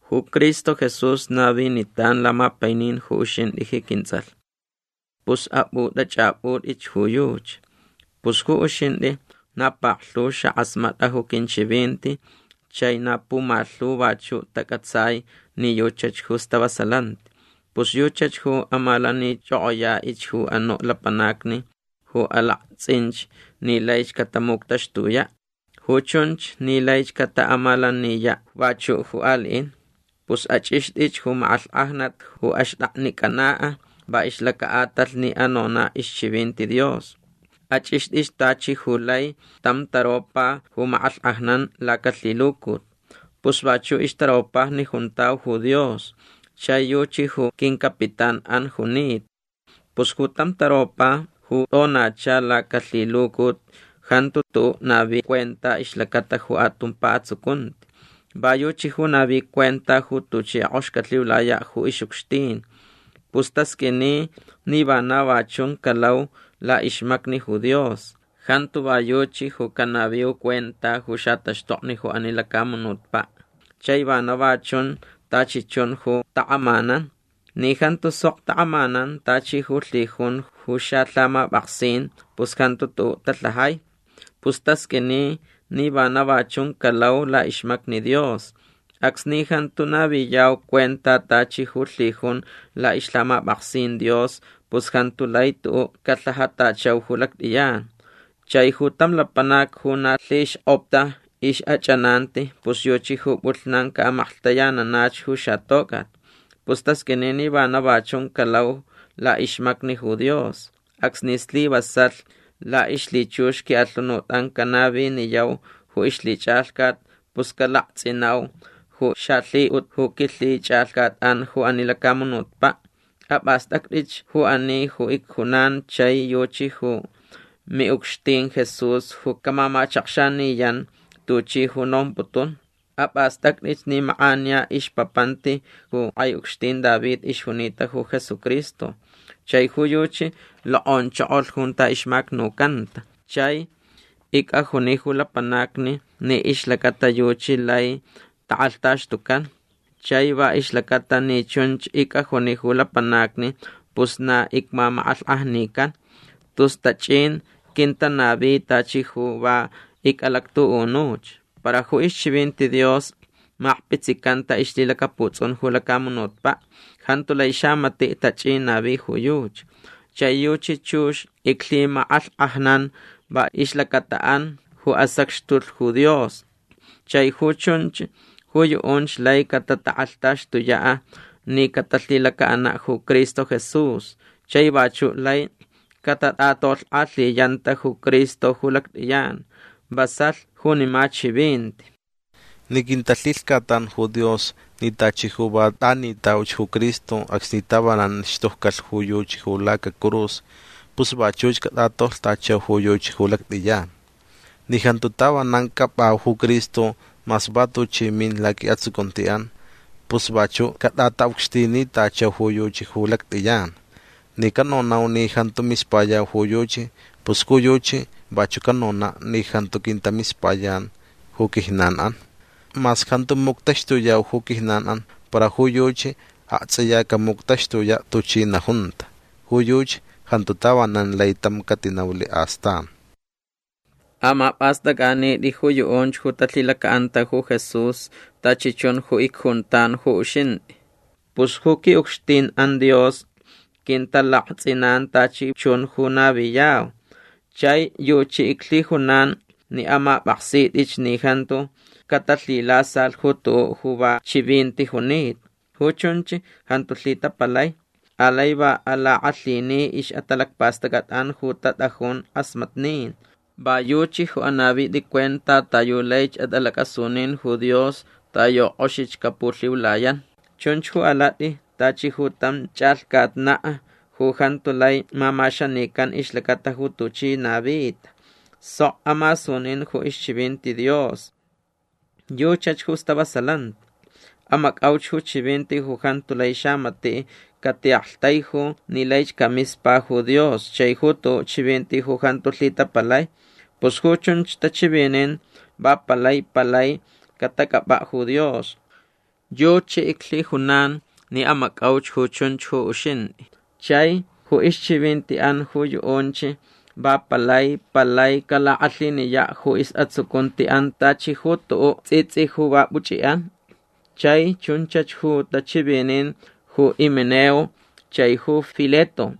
Ju Cristo Jesús navinitan lamapainin ju uxintʼi ji quintsʼalh. Pus apʼutʼachʼapʼutʼich ju yuchi. Pus ju uxintʼi na paklhu xakʼasmatʼa ju quinchivinti chai na pumalhu vachuʼ tacʼatsai ni yuchach ju stavasalanti. Pus yuchach ju amalanichʼokʼoyaʼich ju anuʼ lapanacni ju alaktsʼinch ni laich catamuctaxtuyaʼ. Ju chunch ni laich cataʼamalaniyaʼ vachuʼ ju aliʼin. Pus achʼixtʼich ju makʼalhkʼajnat ju axtʼaknicʼanaʼ va ixlacaʼatalh ni anonaʼ ixchivinti Dios. Achʼixtʼich tachi ju lai tam taropa ju makʼalhkʼajnan lacalhilucut. Pus vachuʼ ixtaropajni juntau ju Dios chai yuchi ju quincapitánʼan junita. Pus ju tam taropa ju tʼonacha lacalhilucut jantu tuʼuʼ navi cuenta ixlacata ju atumpa atsucunti. Va yuchi ju navi cuenta ju tuchi kʼox calhiulayaʼ ju ixʼucxtin. Pus tasqʼuini ni vana va chun calau laʼixmacni ju Dios. Jantu va yuchi ju canaviu cuenta ju xataxtokni ju ani lacamunutpaʼ. Chai vana va chun tachi chun ju takʼamanan. Ni jantu sok takʼamanan tachi ju lhijun ju xalhamapʼaksin pus jantu tuʼuʼ talhajai. Pus tasqʼuini ni vana va chun calau laʼixmacni Dios. Acsni jantu naviyau cuenta tachi ju lhijun laʼixlhamapʼaksin Dios pus jantu lai tuʼuʼ calhajatachau ju lactʼiyan. Chai ju tam lapanac ju na lhixkʼopta ixʼachʼananti pus yuchi ju pʼulhnan caʼamaklhtayananach ju xatocʼat. Pus tasqʼuini ni vana va chun calau laʼixmacni ju Dios. Acsni slivasalh laʼixlhichux quiʼalhunutʼan canaviniyau ju ixlhichʼalhcat pus calaktsʼinau ju xalhiʼut ju quilhichʼalhcatʼan ju ani lacamunutpaʼ. Apʼastʼactʼich ju ani ju icjunan chai yuchi ju miʼucxtin Jesús ju camamachakxaniyan tuchi ju nomputun. Apʼastʼactʼich ni makʼaniya ixpapanti ju kʼai ucxtin David ixjunita ju Jesucristo. Chai ju yuchi lokʼonchokolh junta ixmacnucanta. Chai icʼajuni ju lapanacni ni ixlacata yuchi lai takʼalhtaxtucan. Chai va ixlacata ni chunch icʼajuni ju lapanacni pus na icmamakʼalhkʼajnican. Tus tachʼin quintanavi tachi ju va icʼalactuʼunuch. Para ju ixchivinti Dios makpitsicanta ixlhilacaputsʼun ju lacamunutpaʼ. Jantu lai xamatiʼ tachʼin navi ju yuchi. Chai yuchi chux iclhimakʼalhkʼajnan va ixlacataʼan ju asacxtulh ju Dios. Chai ju chunch ju yuʼunch lai catatakʼalhtaxtuyaʼ ni catalhilacaʼanaʼ ju Cristo Jesús. Chai vachuʼ laich catatʼatolhkʼalhiyanta ju Cristo ju lactʼiyan. Vasalh junima chivinti. Ni quintalhilhcatan ju Dios ni tachi ju va tʼanitauch ju Cristo acsni tavanan xtujcalh ju yuchi ju lacacurus pus vachuch catʼatolhtachau ju yuchi ju lactʼiyan. Ni jantu tavanan cʼapʼau ju Cristo mas va tuchi min laquiʼatsucuntiʼan pus vachuʼ catʼataʼucxtinitachau ju yuchi ju lactʼiyan. Ni canonau ni jantu mispayau ju yuchi pus ju yuchi vachuʼ canonaʼ ni jantu quintamispayan ju quijnanʼan. Mas jantu muctaxtuyau ju quijnanʼan para ju yuchi aktsʼiya camuctaxtuyaʼ tuchi najunta. Ju yuchi jantu tavanan lai tam catinaulh astan. Amapʼastʼacʼanitʼi ju yuʼunch ju talhilacaʼanta ju Jesús tachi chun ju icjuntan ju uxintʼi. Pus ju quiʼucxtinʼan Dios quintalaktsʼinan tachi chun ju naviyau. Chai yuchi iclhijunan ni amapʼaksitʼich ni jantu catalhilasalh ju tuʼuʼ ju va chivinti junita. Ju chunch jantu lhitapalai. Alai va alakʼalhini ixʼatalacpastʼacʼatʼan ju tatʼajun kʼasmatnin. Va yuchi ju anavitʼi cuenta ta yu laich atʼalacʼasunin ju Dios ta yu kʼoxich capulhiulayan. Chunch ju alatʼi tachi ju tam chʼalhcatnaʼ ju jantu lai mamaxanican ixlacata ju tuchi navita. Sok amasunin ju ixchivinti Dios. Yuchach ju stavasalanti. Amacʼauch ju chivinti ju jantu lai xamatiʼ catiʼaktaiju ni laich camispa ju Dios chai ju tuʼuʼ chivinti ju jantu lhitapalai. Pus ju chunch tachivinin va palai palai catacʼapʼaʼ ju Dios. Yuchi iclhijunan ni amacʼauch ju chunch ju uxintʼi. Chai ju ixchivintiʼan ju yuʼunch va palai palai calakʼalhiniyaʼ ju isʼatsucuntiʼan tachi ju tuʼuʼ tsʼitsʼi ju va puchʼiʼan. Chai chunchach ju tachivinin ju Himeneo chai ju Fileto.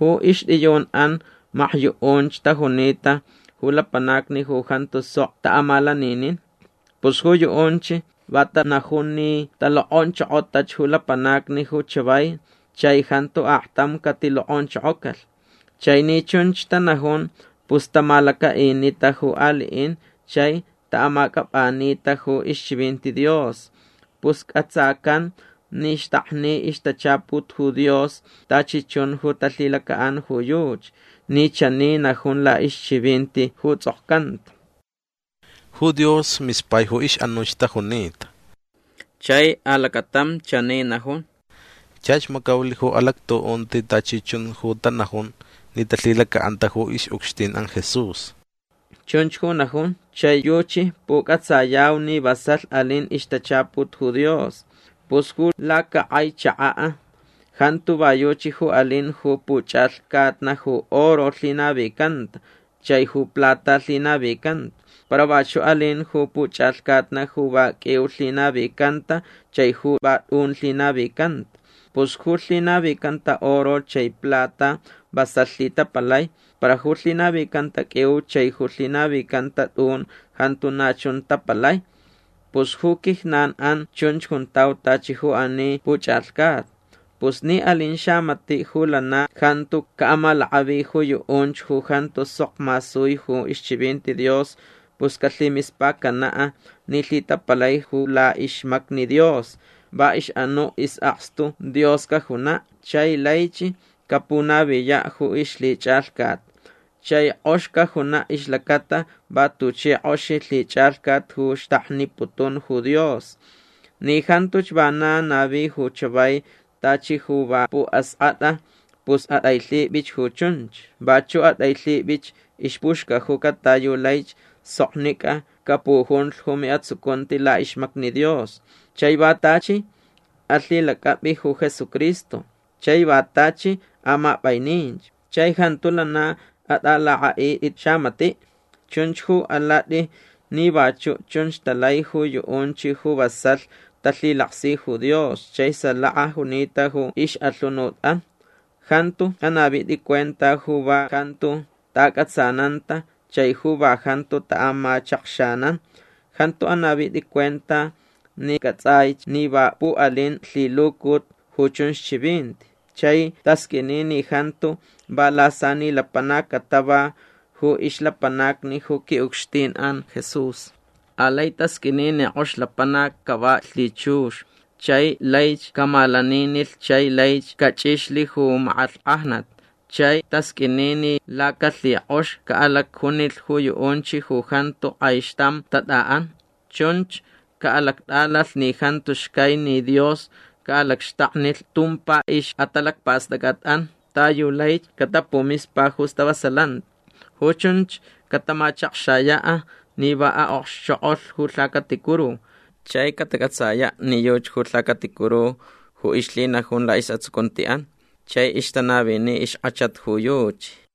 Ju ixtʼiyunʼan makyuʼunch tajunita ju lapanacni ju jantu sok taʼamalaninin. Pus ju yuʼunch va tanajun ni alokʼonchokocantach ju lapanacni ju chavai chai jantu aktam catilokʼonchokocalh. Chai ni chunch tanajun pus tamalacaʼinita ju aliʼin chai taʼamacʼapʼanita ju ixchivinti Dios. Pus cʼatsacan ni xtakni ixtachaput ju Dios tachi chun ju talhilacaʼan ju yuchi ni chani najun laʼixchivinti ju tsʼokcanta: “Ju Dios mispai ju ixʼanuch tajunita”. Chai alacatam chani najun: “Chach macaulh ju alactuʼunti tachi chun ju tanajun ni talhilacaʼanta ju ixʼucxtinʼan Jesús”. Chunch ju najun chai yuchi pucʼatsayau ni vasalh alin ixtachaput ju Dios. Pus ju lacakʼai chakaʼ jantu va yuchi ju alin ju puchʼalhcatna ju oro lhinavicanta chai ju plata lhinavicanta. Para vachuʼ alin ju puchʼalhcatna ju va qʼuiu lhinavicanta chai ju va tʼun lhinavicanta. Pus ju lhinavicanta oro chai plata vasalh lhitapalai. Para ju lhinavicanta qʼuiu chai ju lhinavicanta tʼun jantu na chun tapalai. Pus ju quijnanʼan chunch juntau tachi ju ani puchʼalhcatna. Pus ni alin xamatiʼ ju lana jantu caʼamalakʼavi ju yuʼunch ju jantu sok masui ju ixchivinti Dios pus calhimispacanaʼ ni lhitapalai ju laʼixmacni Dios. Va ixʼanuʼ isʼakstu Dios cajunaʼ chai laich capunaviyaʼ ju ixlhichʼalhcat. Chai kʼox cajunaʼ ixlacata va tuchi kʼoxi lhichʼalhcat ju xtakniputun ju Dios. Ni jantuch vana navi ju chavai tachi ju va puʼaskʼatʼa pus atʼailhipʼich ju chunch. Vachuʼ atʼailhipʼich ixpuxcajuca ta yu laich soknicʼa capujunlh ju miʼatsucunti laʼixmacni Dios. Chai va tachi alhilacʼapʼi ju Jesucristo. Chai va tachi amapʼainininch. Chai jantu lana atʼalakʼaʼitʼich xamatiʼ. Chunch ju alatʼi ni vachuʼ chunch talai ju yuʼunch ju vasalh talhilaksi ju Dios chai salaka junita ju ixʼalhunutʼan. Jantu anavitʼi cuenta ju va jantu taʼacʼatsananta chai ju va jantu taʼamachakxanan. Jantu anavitʼi cuenta ni cʼatsʼaich ni va puʼalin lhilucut ju chunch chivinti. Chai tasqʼuini ni jantu va lasani lapanacni catava ju ixlapanacni ju quiʼucxtinʼan Jesús. Alai tasqʼuini ni kʼox lapanac cava lhichux chai laich camalaninilh chai laich cachʼixlh ju makʼalhkʼajnat. Chai tasqʼuini ni lacalhikʼox caʼalacjunilh ju yuʼunch ju jantu kʼaixtam tatʼaʼan. Chunch caʼalactʼalalh ni jantu xcai ni Dios caʼalacxtaknilh tumpa ixʼatalacpastʼacʼatʼan ta yu laich catapumispa ju stavasalanti. Ju chunch catamachakxayaʼ ni va aʼokxchokʼolh ju lhacaticuru. Chai catacʼatsayaʼ ni yuchi ju lhacaticuru ju ixlhinajun laʼisʼatsucuntiʼan chai ixtanavini ixkʼachat ju yuchi.